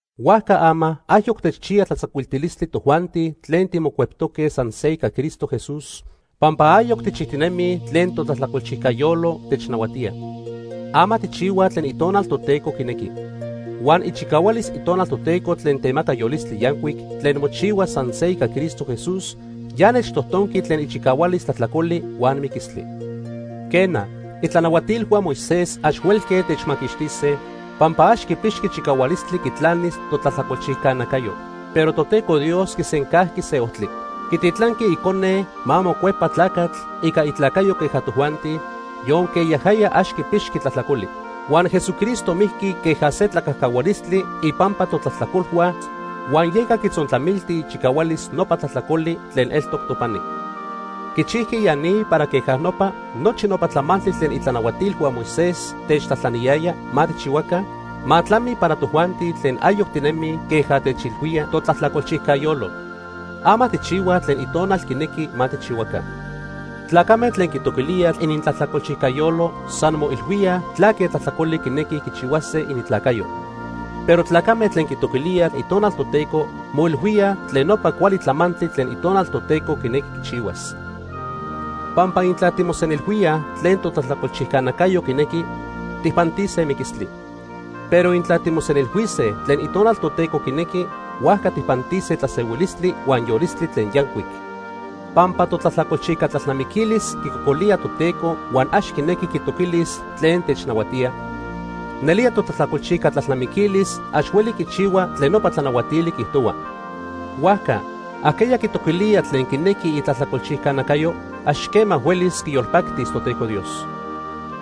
Huajca ama ayoc techchiya tlatzacuiltilistli tojuanti tlen timocueptoque san se ica Cristo Jesús, pampa ayoc tijchijtinemij tlen totlajtlacolchijca yolo technahuatía. Ama tijchihuaj tlen Itonal Toteco quinequi. Huan ichicahualis Itonal Toteco tlen temaca yolistli yancuic tlen mochihua san se ica Cristo Jesús, ya nechtojtonqui tlen ichicahualis tlajtlacoli huan miquistli. Quena, itlanahuatilhua Moisés ax huelque techmaquixtise, pampa ax quipixqui chicahualistli quitlanis totlajtlacolchijca nacayo. Pero Toteco Dios quisencajqui se ojtli. Quititlanqui Icone ma mocuepa tlacatl ica itlacayo queja tojuanti, yonque yajaya ax quipixqui tlajtlacoli. Huan Jesucristo mijqui queja se tlacajcahualistli ipampa totlajtlacolhua huan yeca quitzontlamilti ichicahualis nopa tlajtlacoli tlen eltoc topani. Quichijqui ya ni para queja nopa, nochi nopa tlamantli tlen itlanahuatilhua Moisés techtlajtlaniyayaj ma tijchihuaca, ma tlami para tojuanti tlen ayoc tinemij queja techilhuía totlajtlacolchijca yolo. Ama tijchihuaj tlen Itonal quinequi ma tijchihuaca. Tlacame tlen quitoquilíaj inintlajtlacolchijca yolo san moilhuíaj tlaque tlajtlacoli quinequij quichihuase inintlacayo. Pero tlacame tlen quitoquilíaj Itonal Toteco moilhuíaj tlen nopa cuali tlamantli tlen Itonal Toteco quinequi quichihuas. Pampa intla timosenilhuíaj tlen totlajtlacolchijca nacayo quinequi, tijpantise miquistli. Pero intla timosenilhuise tlen Itonal Toteco quinequi, huajca tijpantise tlasehuilistli huan yolistli tlen yancuic. Pampa totlajtlacolchijca tlalnamiquilis quicocolía Toteco huan ax quinequi quitoquilis tlen technahuatía. Nelía totlajtlacolchijca tlalnamiquilis ax hueli quichihua tlen nopa tlanahuatili quiijtohuaj. Huajca ajqueya quitoquilía tlen quinequi itlajtlacolchijca nacayo, ax quema huelis quiyolpactis Toteco Dios.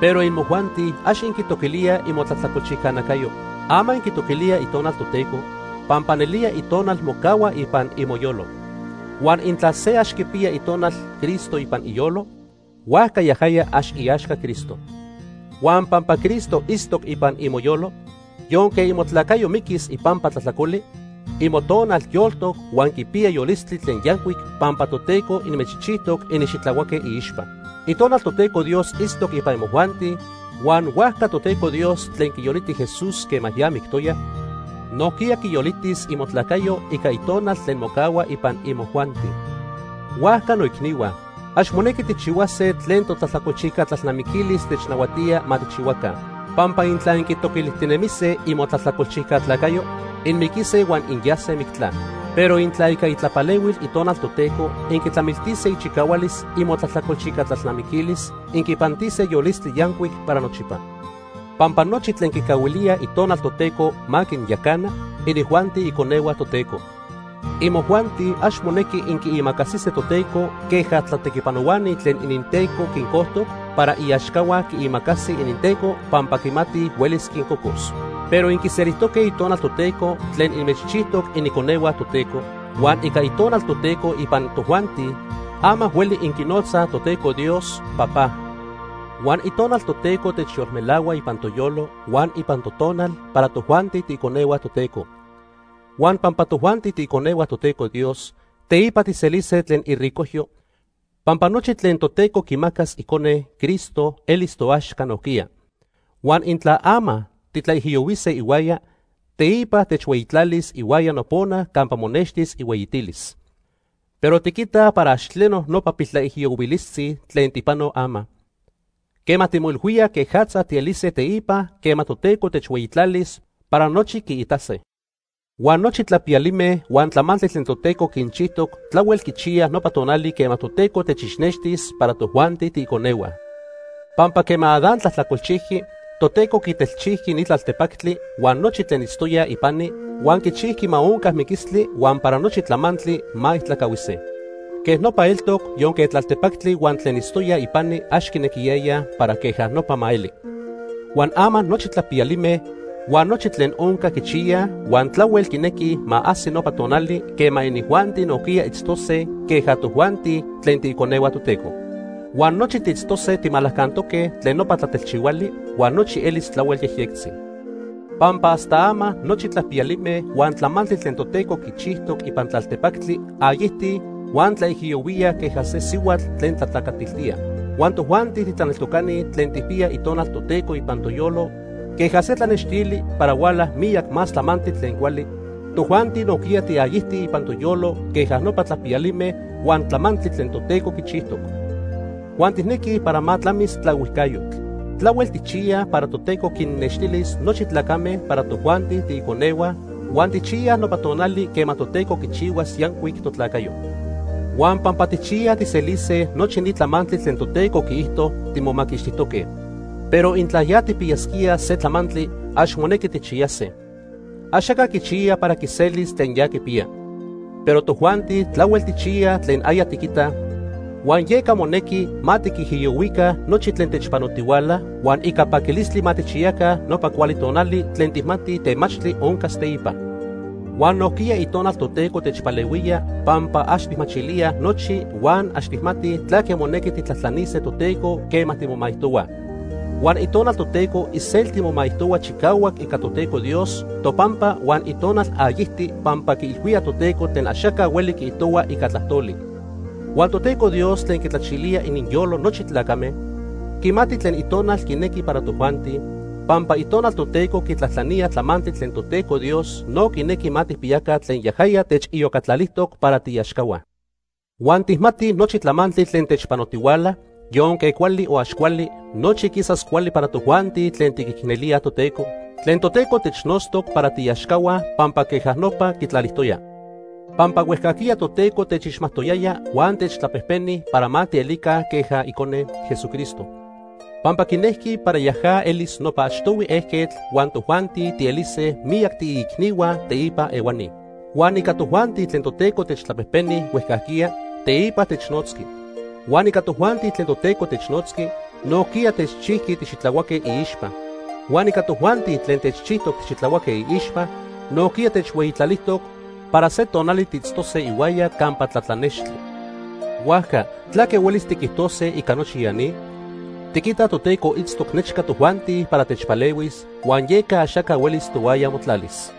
Pero imojuanti ax inquitoquilíaj imotlajtlacolchijca nacayo. Ama inquitoquilíaj Itonal Toteco, pampa nelía Itonal mocahua ipan imoyolo. Huan intla se ax quipiya Itonal Cristo ipan iyolo, huajca yajaya ax iaxca Cristo. Huan pampa Cristo itztoc ipan imoyolo, yonque imotlacayo miquis ipampa tlajtlacoli, imotonal yoltoc huan quipiya yolistli tlen yancuic pampa Toteco inmechchijtoc inxitlahuaque iixpa. Itonal Toteco Dios itztoc ipan imojuanti, huan huajca Toteco Dios tlen quiyoliti Jesús quema ya mictoya, nojquiya quiyolitis imotlacayo ica Itonal tlen mocahua ipan imojuanti. Huajca noicnihua, ax monequi tijchihuase tlen totlajtlacolchijca tlalnamiquilis technahuatía ma tijchihuaca. Pampa intla inquitoquilijtinemise imotlajtlacolchijca tlacayo, inmiquise huan inyase mictla. Pero intla ica itlapalehuil Itonal Toteco inquitlamiltise ichicahualis imotlajtlacolchijca tlalnamiquilis, inquipantise yolistli yancuic para nochipa. Pampa nochi tlen quicahuilíaj Itonal Toteco ma quinyacana, inijuanti iconehua Toteco. Imojuanti ax monequi inquiimacasise Toteco queja tlatequipanohuani tlen ininteco quincojtoc para iaxcahua quiimacasij ininteco pampa quimatij huelis quincocos. Pero inquiselijtoque Itonal Toteco tlen inmechchijtoc iniconehua Toteco, huan ica Itonal Toteco ipan tojuanti ama hueli inquinotzaj Toteco Dios: “Papá.” Huan Itonal Toteco techyolmelahua ipan toyolo huan ipan totonal para tojuanti tiiconehua Toteco. Huan pampa tojuanti tiiconehua Toteco Dios, teipa tijselise tlen iricojyo, pampa nochi tlen Toteco quimacas Icone, Cristo, elis toaxca nojquiya. Huan intla ama titlaijiyohuise ihuaya, teipa techhueyitlalis ihuaya nopona campa monextis ihueyitilis. Pero tiquitaj para ax tleno nopa piltlaijiyohuilistzi tlen tipanoj ama, quema timoilhuíaj quejatza tielise teipa quema Toteco techhueyitlalis para nochi quiitase. Huan nochi tlapiyalime huan tlamantli tlen Toteco quinchijtoc tlahuel quichiyaj nopa tonali quema Toteco techixnextis para tojuanti tiiconehua. Pampa quema Adán tlajtlacolchijqui, Toteco quitelchijqui ni tlaltepactli huan nochi tlen itztoyaj ipani huan quichijqui ma onca miquistli huan para nochi tlamantli ma ijtlacahuise. Quej nopa eltoc yonque tlaltepactli huan tlen itztoyaj ipani ax quinequiyayaj para queja nopa ma eli. Huan ama nochi tlapiyalime huan nochi tlen onca quichiyaj, huan tlahuel quinequij ma ajsi nopa tonali quema inijuanti nojquiya itztose queja tojuanti tlen tiiconehua Toteco. Huan nochi tiitztose timalacantoque tlen nopa tlatelchihuali, huan nochi elis tlahuel yejyectzi. Pampa hasta ama nochi tlapiyalime huan tlamantli tlen Toteco quichijtoc ipan tlaltepactli ayijtij huan tlaijiyohuíaj queja se sihuatl tlen tlatlacatiltía. Huan tojuanti titlaneltocani tlen tijpiyaj Itonal Toteco ipan toyolo queja se tlanextili para huala miyac más tlamantli tlen cuali, tojuanti nojquiya tiayijtij ipan toyolo queja nopa tlapiyalime huan tlamantli tlen Toteco quichijtoc. Huan tijnequij para ma tlamis tlaohuijcayotl. Tlahuel tijchiyaj para Toteco quinnextilis nochi tlacame para tojuanti tiiconehua, huan tijchiyaj nopa tonali quema Toteco quichihuas yancuic totlacayo. Huan pampa tijchiyaj tijselise nochi ni tlamantli tlen Toteco quiijto, timomaquixtijtoque. Pero intla ya tijpiyasquíaj se tlamantli, ax monequi tijchiyase. Axaca quichiya para quiselis tlen ya quipiya. Pero tojuanti tlahuel tijchiyaj tlen aya tiquitaj, huan yeca monequi ma tiquijiyohuica nochi tlen techpanotihuala, huan ica paquilistli ma tijchiyaca nopa cuali tonali tlen tijmatij temachtli oncas teipa. Huan nojquiya Itonal Toteco techpalehuía pampa ax tijmachilíaj nochi huan ax tijmatij tlaque monequi tijtlajtlanise Toteco quema timomaijtohuaj. Huan Itonal Toteco iselti momaijtohua chicahuac ica Toteco Dios topampa huan Itonal ayijti pampa quiilhuía Toteco tlen axaca hueli quiijtohua ica tlajtoli. Huan Toteco Dios tlen quitlachilía ininyolo nochi tlacame, quimati tlen Itonal quinequi para tojuanti, pampa Itonal Toteco quitlajtlanía tlamantli tlen Toteco Dios no quinequi ma tijpiyaca tlen yajaya techiyocatlalijtoc para tiiaxcahua. Huan tijmatij nochi tlamantli tlen techpanotihuala, yonque cuali o ax cuali, nochi quisas cuali para tojuanti tlen tiquicnelíaj Toteco, tlen Toteco technotztoc para tiiaxcahua pampa queja nopa quitlalijtoya. Pampa huejcajquiya Toteco techixmajtoyaya huan techtlapejpeni para ma tielica queja Icone, Jesucristo, pampa quinejqui para yaja elis nopa achtohui ejquetl huan tojuanti tielise miyac tiiicnihua teipa ehuani. Huan ica tojuanti tlen Toteco techtlapejpeni huejcajquiya, teipa technotzqui. Huan ica tojuanti tlen Toteco technotzqui, nojquiya techchijqui tixitlahuaque iixpa. Huan ica tojuanti tlen techchijtoc tixitlahuaque iixpa, nojquiya techhueyitlalijtoc para se tonali tiitztose ihuaya campa tlatlanextli. Huajca ¿tlaque huelis tiquijtose ica nochi ya ni? Tiquitaj Toteco itztoc nechca tojuanti para techpalehuis, huan yeca axaca huelis tohuaya motlalis.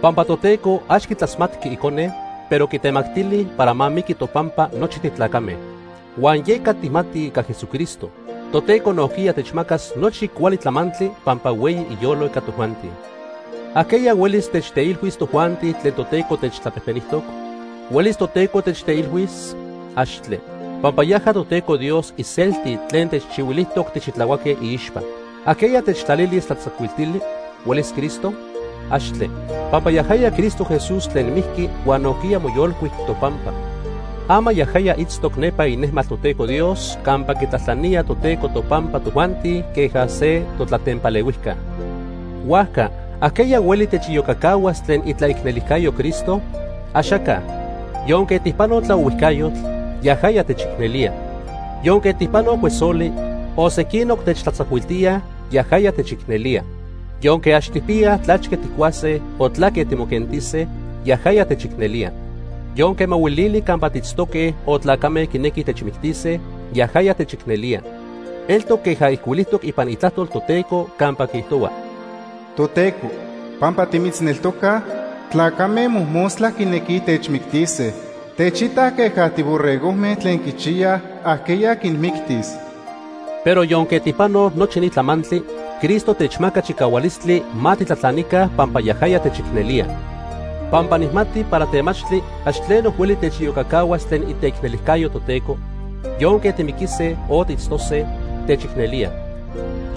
Pampa Toteco ax quitlasmatqui Icone, pero quitemactili para ma miqui topampa nochi titlacame. Huan yeca tijmatij ica Jesucristo, Toteco nojquiya techmacas nochi cuali tlamantli pampa hueyi iyolo ica tojuanti. ¿Ajqueya huelis techteilhuis tojuanti tlen Toteco techtlapejpenijtoc? ¿Huelis Toteco techteilhuis? ¡Axtle! Pampa yaja Toteco Dios iselti tlen techchihuilijtoc tixitlahuaque iixpa. ¿Ajqueya techtlalilis tlatzacuiltili? ¿Huelis Cristo? ¡Axtle! Pampa yajaya Cristo Jesús tlen mijqui huan nojquiya moyolcuic topampa. Ama yajaya itztoc nepa inejmatl Toteco Dios campa quitlajtlanía Toteco topampa tojuanti queja se totlatempalehuijca. Huajca ¿ajqueya hueli techiyocacahuas tlen itlaicnelijcayo Cristo? ¡Axaca! Yonque tijpanoj tlaohuijcayotl, yajaya techicnelía. Yonque tijpanoj cuesoli, o sequinoc techtlatzacuiltíaj, yajaya techicnelía. Yonque ax tijpiyaj tlachque tijcuase o tlaque timoquentise, yajaya techicnelía. Yonque mahuilili campa tiitztoque o tlacame quinequij techmictise, yajaya techicnelía. Eltoc queja ijcuilijtoc ipan Itlajtol Toteco campa quiijtohua: “Toteco, pampa timitzneltocaj, tlacame mojmostla quinequij techmictise. Techitaj queja tiborregojme tlen quichiyaj ajqueya quinmictis.” Pero yonque tijpanoj nochi ni tlamantli, Cristo techmaca chicahualistli ma titlatlanica pampa yajaya techicnelía. Pampa nijmati para temachtli ax tleno hueli techiyocacahuas tlen iteicnelijcayo Toteco. Yonque timiquise o tiitztose, techicnelía.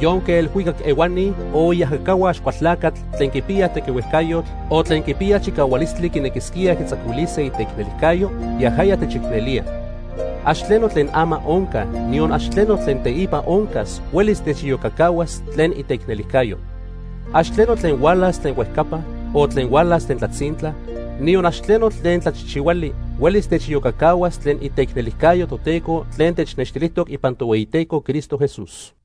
Yonque elhuicac ehuani, o iajacahua Axcualtlacatl tlen quipiyaj tequihuejcayotl o tlen quipiyaj chicahualistli quinequisquíaj quitzacuilise iteicnelijcayo, yaja techicnelía. Ax tleno tlen ama onca, niyon ax tleno tlen teipa oncas huelis techiyocacahuas tlen iteicnelijcayo. Ax tleno tlen hualas tlen huejcapa, o tlen hualas tlen tlatzintla, niyon ax tleno tlen tlachijchihuali, huelis techiyocacahuas tlen iteicnelijcayo Toteco tlen technextilijtoc ipan Tohueyiteco Cristo Jesús.